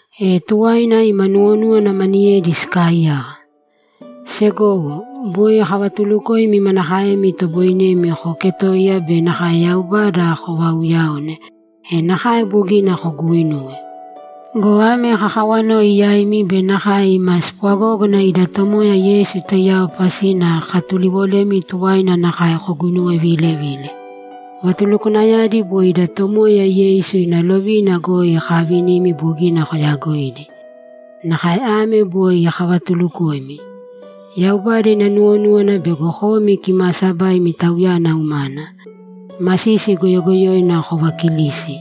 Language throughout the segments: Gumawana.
E tuwaina ima nuwonúwana maniyedi sikaaiyaka. Segowo, boi kavatulukoimi manakaemi itoboinemi kooketoiya be nakae Yaubada kovaauyaone, e nakae bogina koguuinuwe. Go ame kakawanoi yaimi be nakae ima spwagógana ida Tomoya Yeisu taiyao pasina kakatuliwolemi tuwaina nakae koguinuwevilevīle. Vatulukwanayadi boi ida Tomoya Yeisu ina lovina goi kaavinimi bogina koyaagoidi. Nakae ame boi kavatulukoimi: Yaubada ina nuwonúwana bego komi kimaasabaimi Tauyana umana, masisi goyogoyoina kovaakilīsi,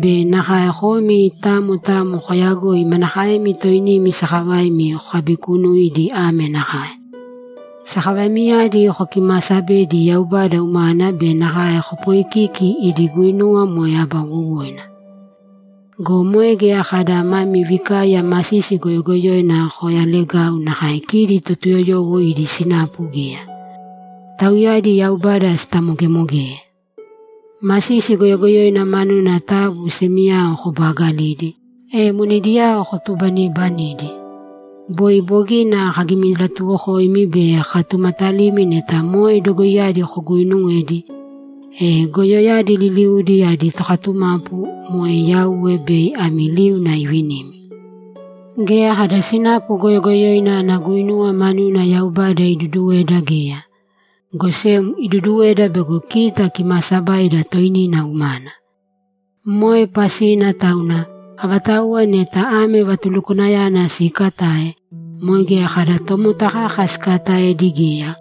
be nakae komi tamo tamo kooyagōi manakaemi toinimi sakavaimi kokabikunuidi ame nakae: Sakavaimiyadi kokimaasabēdi Yaubada umana be nakae kopoikīki idi guinuwa moe aba wowoina. Go moe geya kada mami vikaiya masisi goyogoyoina koyalagau nakae kidi Totuyoyowo idi sinapu geya. Tauyadi Yaubada sitamogemogeye. Masisi goyogoyoina manuna taabu semiyao kobaagalīdi, e monediyao kotubanibanidi. Boi bogina kagimilatuwokoimi be kakatumatalimi neta moe dogoiyadi koguuinuwedi, e goyoyadi liliudi adi tokatumapu, moe Yauwe, bei ami liuna ivinimi. Geya kada sinapu goyogoyoina ana guinuwa manuna Yaubada iduduweda geya, go sem iduduweda bego kita kimaasabaida toinina umana. Moe pasina tauna, avatauwa neta ame vatulukwanayana siikatae, moe geya kada tomota kaka sikaataedi geya,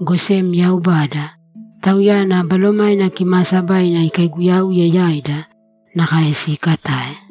go sem Yaubada, Tauyana Balomaina Kimaasabaina ikaiguyauye yaida, nakae siikatae.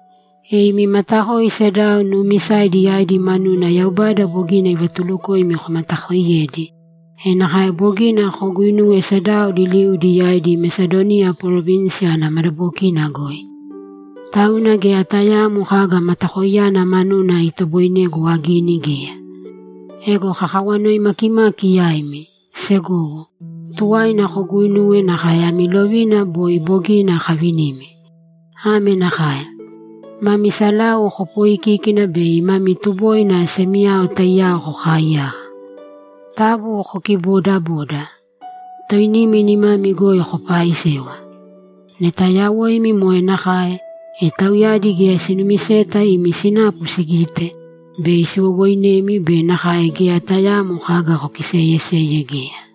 E imi matakoi sedao nuumisaidi yaidi manuna Yaubada bogina ivatulukoimi komatakoiyedi, e nakae bogina koguuinuwe sedao liliudi yaidi Mesadoniya parovinsi ana madabokina goi. Tauna geya tayaamo kaga matakoiyana manuna itoboinegu agini geya. Ego kakawanoi makimaki yaimi, segowo, tuwaina koguuinūwe nakae ami lovina boi bogina kavinimi. Ame nakae: Mami salau kopooikīkina bei mami tuboina semiyao taiyao kokaaiyaka. Taabu kokiboodabōda. Toinimi nimami goi kopaaisēwa. Neta yawoimi moe nakae, e tauyadi geya sinumiseta imi sinapu sigite, bei siwowoinemi be nakae geya tayaamo kaga kokiseyeseye geya.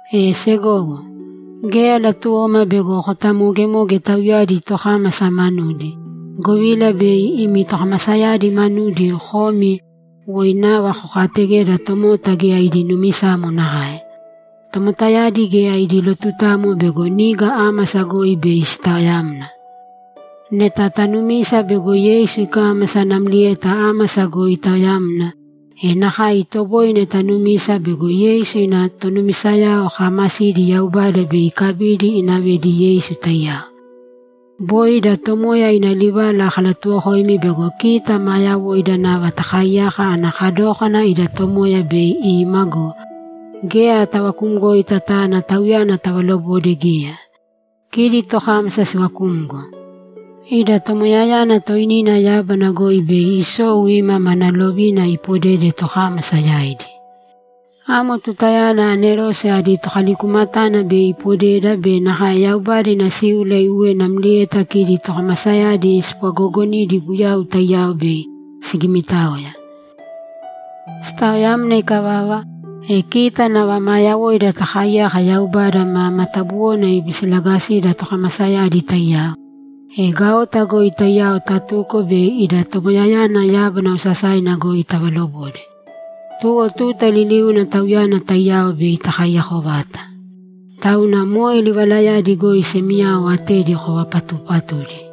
E segowo, geya latuwoma bego kotamogemoge tauyadi tokámasa manudi, govila bei imi tokamasayadi manudi komi woi nava kokaategeda tomota geya idi numisamo nakae. Tomotayadi geya idi lotutamo bego niga ámasa goi bei sitaoyamna. Neta tanumisa bego Yeisu ikámasa namlieta ámasa goi itaoyamna, e nakae itoboine tanumisa bego Yeisu ina tonumisayao kaamasidi Yaubada bei ikabidi inavedi Yeisu taiyao. Boi ida Tomoya ina livala kalatuwokoimi bego kita maa yawoida nava takaaiyaka ana kadókana ida Tomoya bei ima go, geya tavakumgoita tana Tauyana tavalobode geya; kidi tokámasa sivakumgo. Ida Tomoyayana toinina yábana goi bei isou ima mana lovina ipodede tokámasa yaidi. Amo tutayana anerose adi tokalikumatana bei ipodeda be nakae Yaubada ina síula iuwe namlieta kidi tokamasayadi spwagoogonidi Guyau taiyao bei sigimitaoya. Sitaoyamna ikavava, e kita nava maa yawoida takaaiyaka Yaubada ma matabuwona ibisilagasida tokamasayadi taiyao, e gaota goi taiyao tatuko bei ida Tomoyayana yábana osasaina goi tavalobode. Tuwo tuta liliuna Tauyana taiyao bei takaiyako vata. Tauna moe livalayadi goi semiyao atedi kovapatuupatūdi.